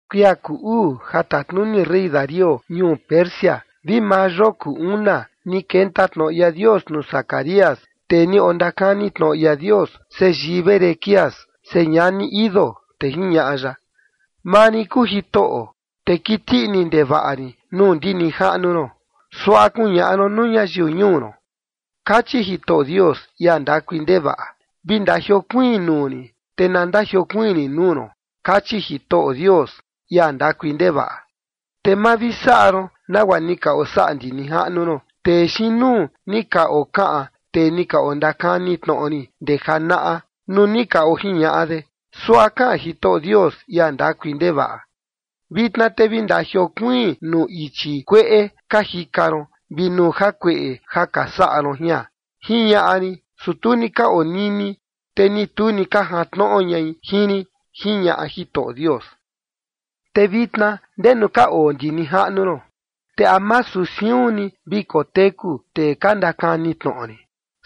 Kuia kuu uu ja tatnuni rey Darío ñuu Persia vi maa yoo kuu una, ni kenta tnoꞌo ia Dios nuu Zacarías, tee ni ondakani tnoꞌo ia Dios, seyii Berquías, señani Iddo, te jiñaꞌa ya: “Maa rin kuu Jitoꞌo, te kiti ini ndevaꞌa rin nuu ndi nijaꞌnu ron. Suaꞌa kuñaꞌa ron nuu ñayiu ñuu ron: Kachi Jitoꞌo Dios, ia ndakui ndevaꞌa: Vi ndajiokuiin nuu rin, te na ndajiokuiin rin nuu ron, kachi Jitoꞌo Dios, ia ndakui ndevaꞌa. Te ma vi saꞌa ron nagua ni ka osaꞌa ndi nijaꞌnu ron, tee xiin nuu ni ka okaꞌan tee ni ka ondakani tnoꞌo rin ndee janaꞌa, nuu ni ka ojiñaꞌa de: Suaꞌa kaꞌan Jitoꞌo Dios, ia ndakui ndevaꞌa: Vitna te vi ndajiokuiin nuu ichi kueꞌe ka jika ron vi nuu jakueꞌe ja ka saꞌa ron jian, jiñaꞌa rin, su tu ni ka onini, te ni tu ni ka jantnoꞌo ñai jin rin, jiñaꞌa Jitoꞌo Dios. ’Te vitna, ¿ndenu ka oo ndi nijaꞌnu ron? Te masu siun ni vi koteku tee ka ndakani tnoꞌo rin.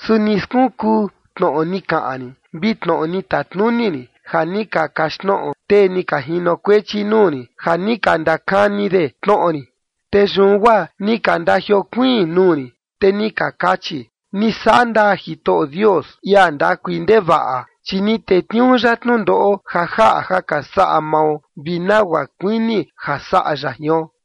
Su ni skunkuu tnoꞌo ni kaꞌan rin vi tnoꞌo ni tatnuni rin, ja ni ka kaxtnoꞌo tee ni ka jinokuechi nuu rin ja ni ka ndakani de tnoꞌo rin. Te yun guaa ni ka ndajiokuiin nuu rin, te ni ka kachi: Ni saꞌa ndaa Jitoꞌo Dios, ia ndakui ndevaꞌa, chi ni tetniuu ya tnundoꞌo ja jaꞌa ja ka saꞌa mao vi nagua kuini ja saꞌa ya jion.”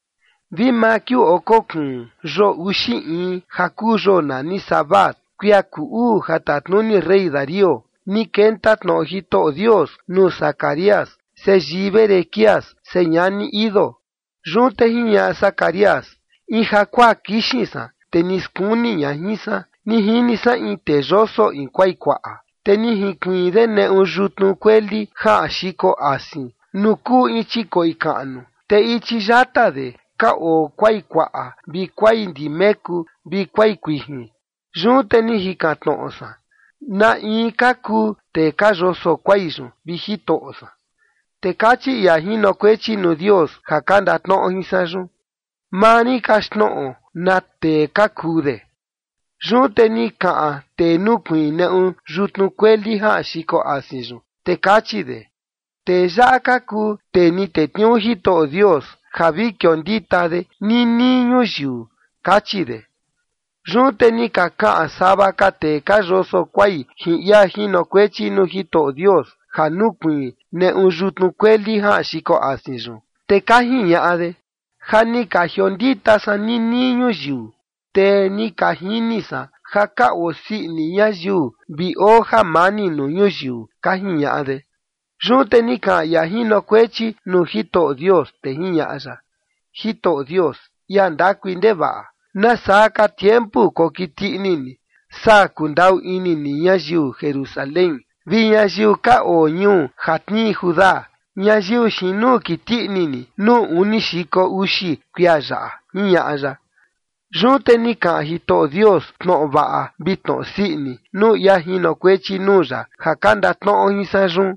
Vi maa kiuu oko kuun, yoo uxi in, ja kuu yoo nani Sebat, kuia kuu uu ja tatnuni rey Darío, ni kenta tnoꞌo Jitoꞌo Dios nuu Zacarías, seyii Berequías, señani Iddo. Yun te jiñaꞌa Zacarías: In jakuaa kixin san, te ni skuni ña jin san. Ni jini san in tee yoso in kuai kuaꞌa. Te ni jinkuiin de neꞌu yutnu kueli jaꞌan xiko asin nuu kuu in chikoꞌi kaꞌnu, te ichi yata de ka oo kuai kuaꞌa vi kuai ndimeku vi kuai kuijin. Yun te ni jikan tnoꞌo san: “¿Na in ka kuu tee ka yoso kuai yun, vi Jitoꞌo san?” Te kachi ia jinokuechi nuu Dios ja ka ndatnoꞌo jin san yun: “Maa rin kaxtnoꞌo na tee ka kuu de”. Yun te ni kaꞌan tee nukuiin neꞌu yutnu kueli jaꞌan xiko asin yun, te kachi de: “Tee yaꞌa ka kuu tee ni tetniuu Jitoꞌo Dios ja vi kiondita de ninii ñuyiu”, kachi de. Yun te ni ka kaꞌan sava ka tee ka yoso kuai jin ia jinokuechi nuu Jitoꞌo Dios ja nukuiin neꞌu yutnu kueli jaꞌan xiko asin yun, te ka jiñaꞌa de: “Ja ni ka jiondita san ninii ñuyiu, te ni ka jini san ja ka osii ini ñayiu vi oo jamani nuu ñuyiu”, ka jiñaꞌa de. Yun te ni kaꞌan ia jinokuechi nuu Jitoꞌo Dios, te jiñaꞌa ya: “Jitoꞌo Dios, ia ndakui ndevaꞌa, ¿nasaa ka tiempu kokiti ini ni saa kundaꞌu ini ni ñayiu Jerusalén vi ñayiu ka oo ñuu ja tnii Judá, ñayiu xiin nuu kiti ini ni nuu uni xiko uxi kuia yaꞌa?”, jiñaꞌa ya. Yun te ni kaꞌan Jitoꞌo Dios tnoꞌo vaꞌa vi tnoꞌo sii ini nuu ia jinokuechi nuu ya ja ka ndatnoꞌo jin san yun.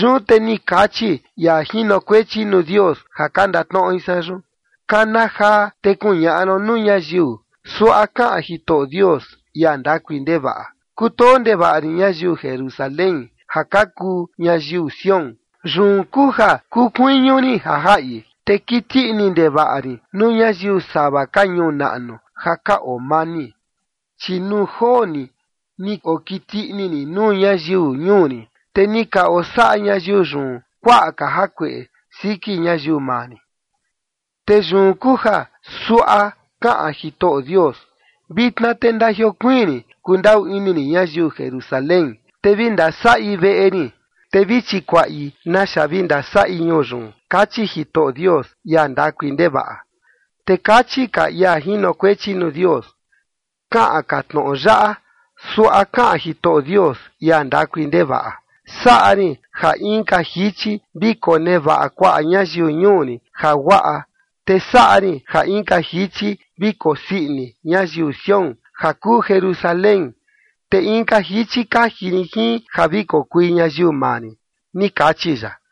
Yun te ni kachi ia jinokuechi nuu Dios ja ka ndatnoꞌo jin san: “Kana jaa te kuñaꞌa ron nuu ñayiu: Suaꞌa kaꞌan Jitoꞌo Dios, ia ndakui ndevaꞌa: Kutoo ndevaꞌa rin ñayiu Jerusalén ja ka kuu ñayiu Sión. Yun kuu ja kuu kuiñu rin ja jaꞌi. Te kiti ini ndevaꞌa rin nuu ñayiu sava ka ñuu naꞌnu ja ka oo mani, chi nuu joo ni ni okiti ini rin nuu ñayiu ñuu rin, te ni ka osaꞌa ñayiu yun kuaꞌa ka jakueꞌe siki ñayiu maa rin. Te yun kuu ja suaꞌa kaꞌan Jitoꞌo Dios: Vitna te ndajiokuiin rin kundaꞌu ini rin ñayiu Jerusalén, te vi ndasaꞌi veꞌe rin, te vi chikuaꞌi naxa vi ndasaꞌi ñuu yun. Kachi Jitoꞌo Dios, ia ndakui ndevaꞌa.” Te kachi ka ia jinokuechi nuu Dios: “Kaꞌan ka tnoꞌo yaꞌa: Suaꞌa kaꞌan Jitoꞌo Dios, ia ndakui ndevaꞌa: Saꞌa rin ja inka jichi vi konevaꞌa kuaꞌa ñayiu ñuu rin jaguaꞌa, te saꞌa rin ja inka jichi vi kosii ini ñayiu Sión, ja kuu Jerusalén, te inka jichi kaji rin jin ja vi kokui ñayiu maa rin, ni kachi ya”.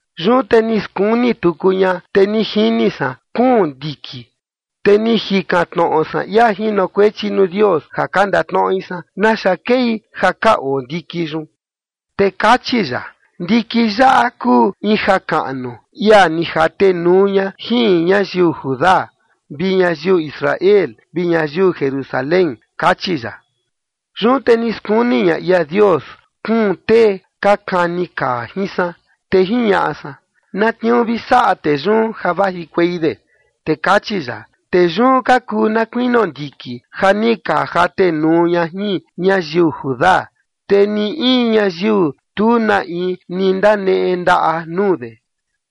Yun te ni skuni tuku ña, te ni jini san kuun ndiki. Te ni jikan tnoꞌo san ia jinokuechi nuu Dios ja ka ndatnoꞌo jin san: “¿Naxa kei ja ka oo ndiki yun?” Te kachi ya: “Ndiki yaꞌa kuu in jakaꞌnu ia ni jatenuu ña jin ñayiu Judá vi ñayiu Israel vi ñayiu Jerusalén”, kachi ya. Yun te ni skuni ña ia Dios kuun tee ka kani kaa jin san. Te jiñaꞌa san: “¿Na tniuu vi saꞌa tee yun ja vajikuei de?” Te kachi ya: “Tee yun ka kuu na kuinio ndiki ja ni ka jatenuu ña jin ñayiu Judá, te ni in ñayiu tu na in ni ndaneꞌe ndaꞌa nuu de.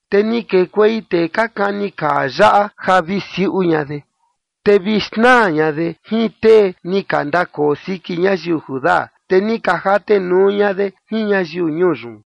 Te ni kekuei tee ka kani kaa yaꞌa ja vi siuꞌu ña de, te vi xnaa ña de jin tee ni ka ndakoo siki ñayiu Judá, te ni ka jatenuu ña de jin ñayiu ñuu yun.”